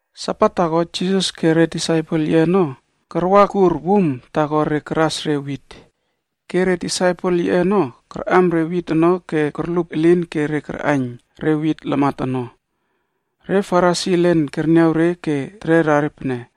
Sabat taako, Jisas koꞌo re disaipel yiꞌe ono karwakur wum taako re karas re wit. Ke re disaipel yiꞌe ono karꞌam re wit ono ke korlup elin ke re karꞌaiyn re wit lamat ono. Re Farisi elen kerniaw re ke terera re pene,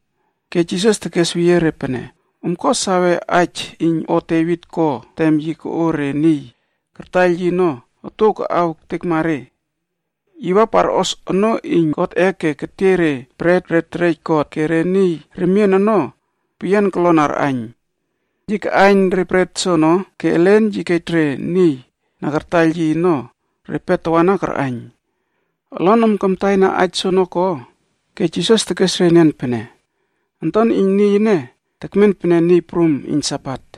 Ke Jisas tekes weyie re pene, “Om ko sawena aij iyn o Devit ko tem yi koꞌo re niy kartaiyl yi ono otuow kaꞌaw ektekma re. Yi wa parꞌos onoo iyn Godꞌe ke ketiey re bret re terej God ke re niy remien ono peyian kolon arꞌaiyn. Yi kaꞌaiyn re bret soono ke elen yi kej re niy na kartaiyl yi ono repe tawana karꞌaiyn. Olonom kamtaina aij soono ko?” Ke Jisas tekes re enian pene, “Onton iyn Niy ene tekmen pene Niy Prum iyn Sabat.”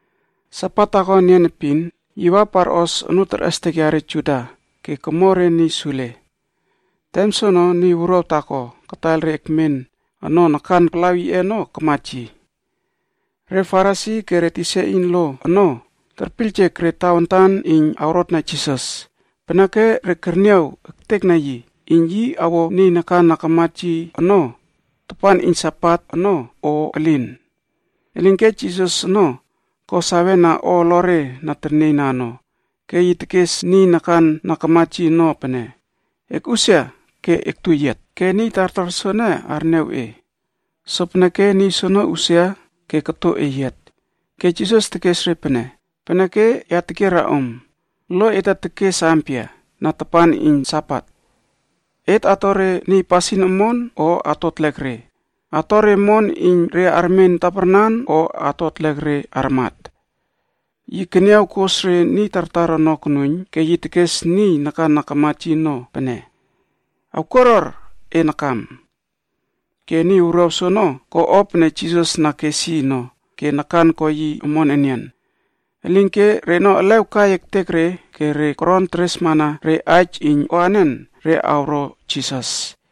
Sabat taako enian epin yi wa parꞌos onoo terꞌestek yare Juda ke komo re niy sule. Tem soono niy wuruaw taako kataiyl re kemen ono nakan palaw yiꞌe ono kamat yi. Re Farisi ke re tisa iyn lo ono kurmustekna re tawantan iyn awrotna Jisas. Peneke re karꞌaiyn ektekna yi iyn yi awo niy nakan na kamat yi ono awo omon tapan iyn Sabatꞌe ono o elin. Elinke Jisas ono ko sawe na o olore na ternieyna ono ke yi tekes niy nakan na kamat yi ono pene, “Ekꞌusia ke ektu eyiat ke niy tartar soene arniaw e.” Sopeneke niy soono usia ke koto eyiat. Ke Jisas tekes re pene, “Peneke, ya tekiera om, lo ete tekes ampia na tapan iyn Sabat? Et ato re niy pasin omon o ato etlek re, ato re omon iyn re armen taparnan o atla re armat?” Yi keniaw kos re niy tartar ono konuiyn ke yi tekes niy nakan na kamat yi ono pene, “Ewkuaruar e nakam.” Ke niy wuruaw soono ko o pene Jisas na kes yi ono ke nakan ko yi omon enian. Elinke reno elew kai ektek re ke re koron teresmana re aij iyn o anen re awro Jisas.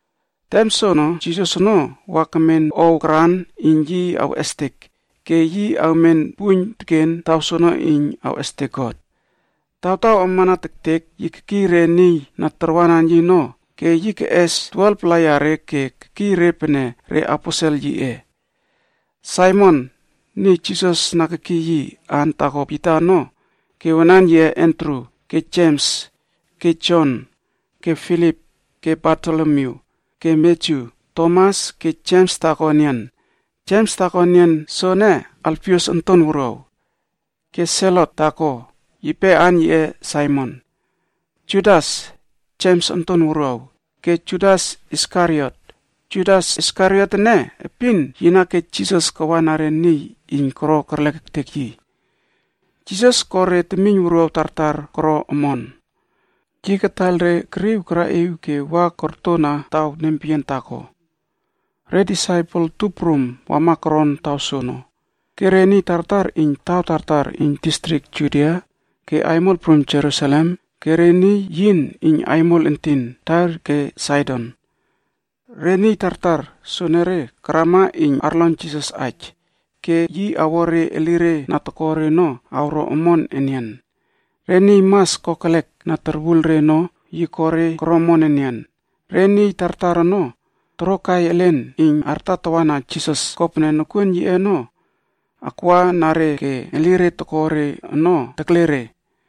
Tem soono Jisas ono wa kemen ow karan iyn yi awꞌestek ke yi awmen puiyn teken taw soono iyn awꞌestek God. Tawtaw amana tektek yi kekiy re disaipel yiꞌe ono ke yi keꞌes 12-pla yare ke kekiy re pene reaposelb yiꞌe: Saimon, niy Jisas na kekiy yi aan taako Pita ono ke wanan yiꞌe Andru ke Jems ke Jon ke Filip ke Bartolomyu. Ke Matyu, Tomas ke Jems taako enian. Jems taako enian soene Alfius onton wuruaw. Ke Selotc taako, yipe aan yiꞌe Saimon. Judas (Jems onton wuruaw) ke Judas Iskariot. Judas Iskariot ene epin yi na kej Jisas kawa re niy iyn koro kerlek ektek yi. Jisas ko re temiyn wuruaw tartar koro omon. Yi kataiyl re keriw karaꞌiw ke wa kortona taw nempeyian taako. Re disaipel tup prum wama koron taw soono ke re niy tartar iyn taw tartar iyn distrik Judia ke aimol prum Jerusalem ke re niy yin iyn aimol entin Tair ke Saidon. Re niy tartar soenere karama iyn arlon Jisas aij ke yi awo re elire na toko re ono awro omon enian. Re niy mas kokelek na torwul re ono, yi ko re koro omon enian. Re niy tartar ono torokai elen iyn artatawa Jisas kopene nokuon yiꞌe ono akwa na re ke elire toko re ono terle re.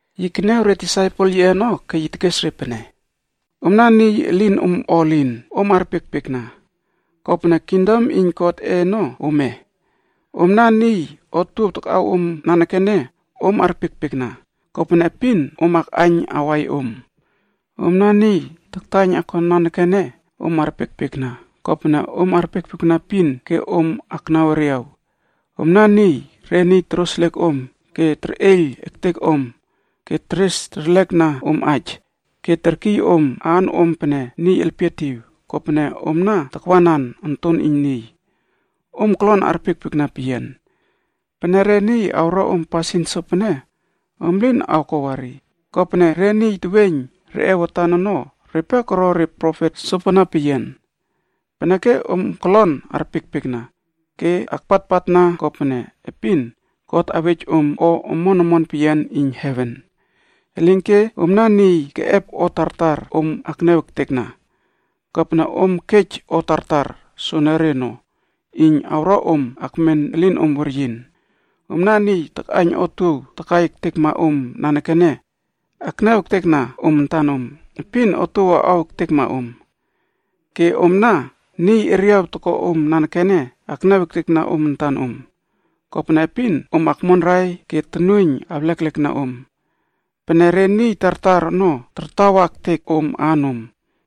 Yi keniaw re disaipel yiꞌe ono ke tekes re pene: “Omna niy elin om o elin, om arpiekpiekna, kopene kingdom iyn Godꞌe ono ome. Omna niy otuow takꞌaw om nanekene, om arpiekpiekna kopene epin om akꞌaiyn awai om. Omna niy taktaiyn okon nanekene, om arpiekpiekna, kopene om arpiekpiekna epin ke om aknaw eriaw. Omna niy re niy toroseliek om ke terꞌeiyl ektek om, ke teres terleklekna om aij ke terkiy om aan om pene niy elpietiw kopene om takwanan Onton iyn Niy. “Om kolon arpiekpiekna peyian. Pene re niy awro om pasin sopene, om lin awko wari, kopene re niy teweiyn reꞌe watan ono repe koro re profet sopana peyian. Peneke om kolon arpiekpiekna ke akpatpatna kopene epin God awej om o omon omon peyian iyn heven. Elinke omna niy keꞌep o tartar om akniaw ektekna, kopene om kej o tartar soenere ono, iyn awro om akmen elinom weryin. Omna niy takꞌaiyn otuow takai ektekma om nanekene, akniaw ektekna om antan om, epin otuow awꞌaw ektekma om. Ke omna niy eriaw toko om nanekene, akniaw ektekna om antan om, kopene epin om akmonrai ke tonuoiyn awleklekna om. Peneke re niy tartar ono tartawa ektek om aanom,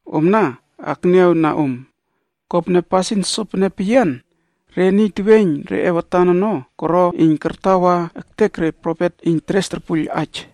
omna akniawna om. Kopene pasin sopene peyian re niy teweiyn reꞌe watan ono koro iyn kartawa ektek re profet iyn teres torpuiyl aij.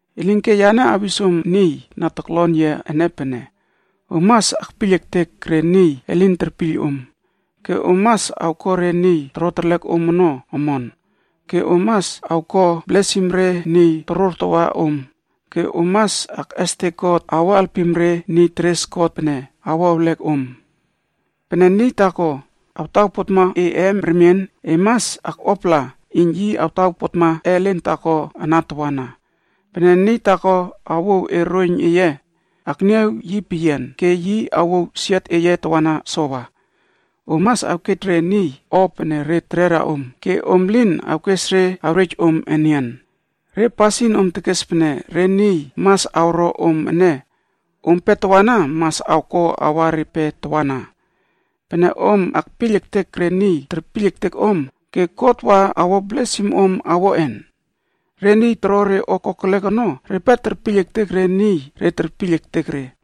“Elinke yane awis om niy na toklon yia ene pene: Om mas akpiyl ektek re niy elin terpiyl om ke om mas awko re niy toro terlek om ono, omon. Ke om mas awko blesim re niy torortawa om, ke om mas akꞌestek God iyn awo alpim re niy teres God pene awo ewlek om. Pene niy taako awtawpotma e eem remien, e mas akꞌuapala iyn yi awtawpotma ellen taako ana tawana. Pene niy taako awouw e roiyn eye, akniaw yi peyian ke yi awouw siot eye tawana sowa. Om mas awkej re niy o pene re terera om ke om lin awkes re awrej om enian. Re pasin om tekes pene re niy mas awro om ene, ompe tawana mas awko awa repe tawana. “Pene om akpiyl ektek re niy terpiyl ektek om, ke God wa awo blesim om awoꞌen? Re niy toro re o kokelek ono repe terpiyl ektek re niy re terpiyl ektek re.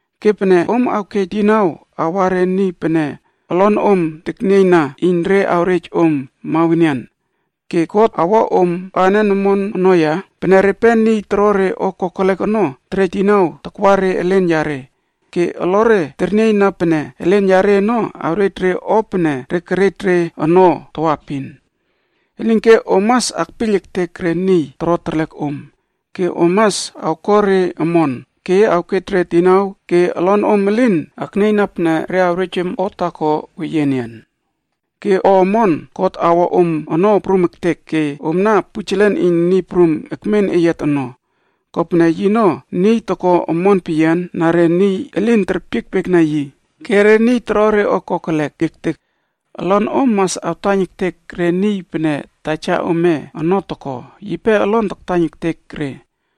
Ke pene om awkej dinau awa re niy pene olonom teknieiyna iyn re awrej om mawenian, ke tawantan ampia God awꞌespaij om ke awo blesim om ono ya? Pene repe niy toro re o kokelek ono terej dinau takwa re elen yare ke olore ternieyna pene elen yare ono awrej re o pene re kerej re ono tawaepin. Elinke om mas akpiyl ektek re niy toro terlek om, ke om mas awko re omon, ke awkej re dinau ke olonom elin aknieyna pene re awrej om o taako weyie enian. Ke o omon God awo om ono prum ektek ke omna pujelen iyn Niy Prum ekmen eyiat ono. Kopene yino niy toko omon peyian na re niy elin terpiekpiekna yi ke re niy toro re o kokelek ektek. Olonom mas awtaiyn ektek re niy pene taja ome ono toko, yipe olon taktaiyn ektek re.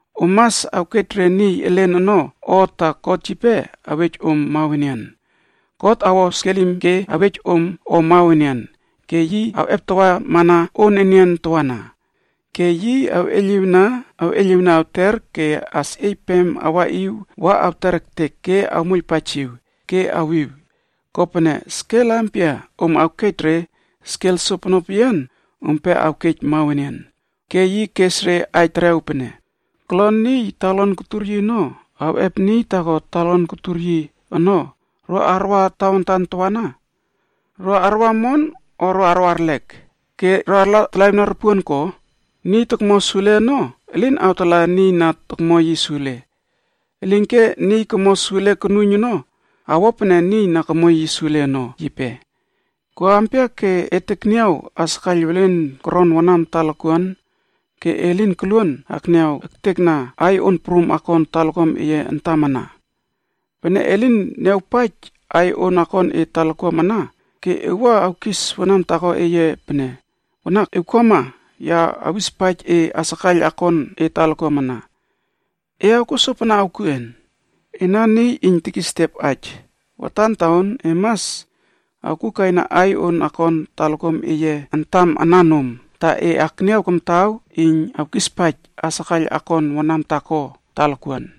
Om mas awkej re niy elen ono o ta God yipe awej om o mawenian. God awo skelim ke awej om o mawenian ke yi awꞌeptawamana on enian tawana. Ke yi awꞌeiylꞌiwna awꞌeiyliwna awter ke asꞌieypem awaꞌiw wa awter ektek ke awmoiylpaijiw ke awiw. Kopene skel ampia om awkej re, skel sopono peyian ompe awkej mawenian.” Ke yi kes re aij terew pene, “Kolon niy talakuan kotur yi ono awꞌep niy taako yipe talakuan kotur yi tawana ono ro arwa tawantan tawana? Ro arwa omon o ro arwaerlek ke arlatalaꞌiwna re ropuon ko? Niy tokmo sule ono, elin awtala niy na tokmo yi sule. Elinke niy komo sule konuiyn ono awo pene niy na komo yi sule ono yipe. “Ko ampia ke e tekniaw asakaiyl welen koron wanam talakuan ke e lin koluon akniaw ektekna aiy on prum akon talakuam eye antam ana? Pene e lin niawpaij aiy on akon e talakuam ana ke e wua awkis wanam taako eye pene, ‘Wanak, ewkuama ya awispaij e asakaiyl akon e talakuam ana’ e awkuo sopana awkuꞌen? Ena niy iyn tekis etiep aij, watan taon e mas awkukaina aiy on akon talakuam eye antam ana nom, ta e akniaw kamtaw iyn awkispaij asakaiyl akon wanam taako talakuan.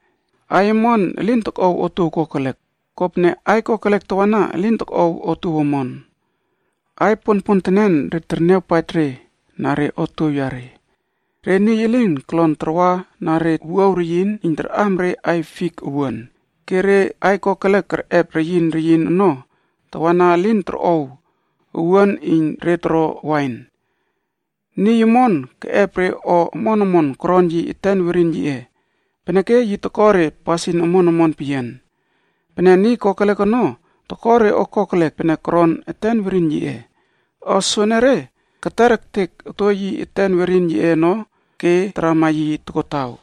“Aiy omon elin tokꞌow otuow kokelek, kopene aiy kokelek tawana elin tokꞌow otuow omon. Aiy ponpontenen re terniawpaij re na re otuow yare. Re niy elin kolon tarwa na re wuaw reyin iyn arꞌam re aiy fik owuan ke re aiy kokelek kerꞌep reyin reyin ono tawana elin torꞌow owuan iyn re toro wain. Niy omon keꞌep re o omon omon koron yi eten werin yiꞌe, peneke yi toko re pasin omon omon peyian. Pene niy kokelek ono, toko re o kokelek pene koron eten werin yiꞌe. O soenere keter ektek okto yi eten werin yiꞌe ono ke tarama yi tokotaw.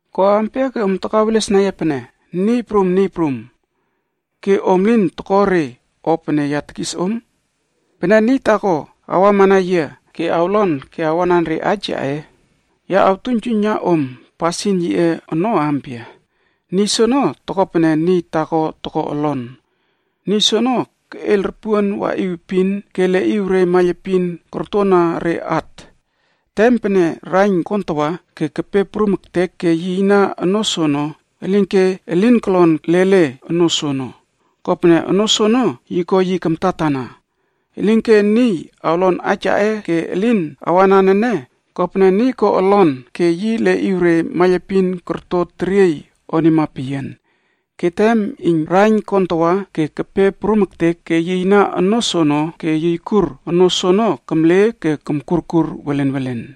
“Ko ampia ke om takawelesna yia pene, ‘Niy Prum, Niy Prum,’ ke om lin toko re o pene ya tekis om? Pene niy taako awamana yia ke awlon ke awanan re aij yaꞌe. Ya awtuiynjuiyna om pasin yiꞌe ono ampia. “Niy soono toko pene niy taako toko olon. Niy soono keꞌeiyl ropuon waꞌiw epin ke leꞌiw re maiylepin kortona re at. Tem pene raiyn kontawa ke kepe prum ektek ke yiyna onoo soono, elinke elin kolon lele onoo soono, kopene onoo soono yi ko yi kamtatana. Elinke niy awlon aij yaꞌe ke elin awanan ene kopene niy leꞌiw re maiylepin iyn olon yiꞌe ono korto teriey onima peyian. Ke tem pene raiyn awontawa ke awpe prum ektek ke awyiyna re maiylepin iyn olon soono, olon soono amle ke komkurkur welenwelen.”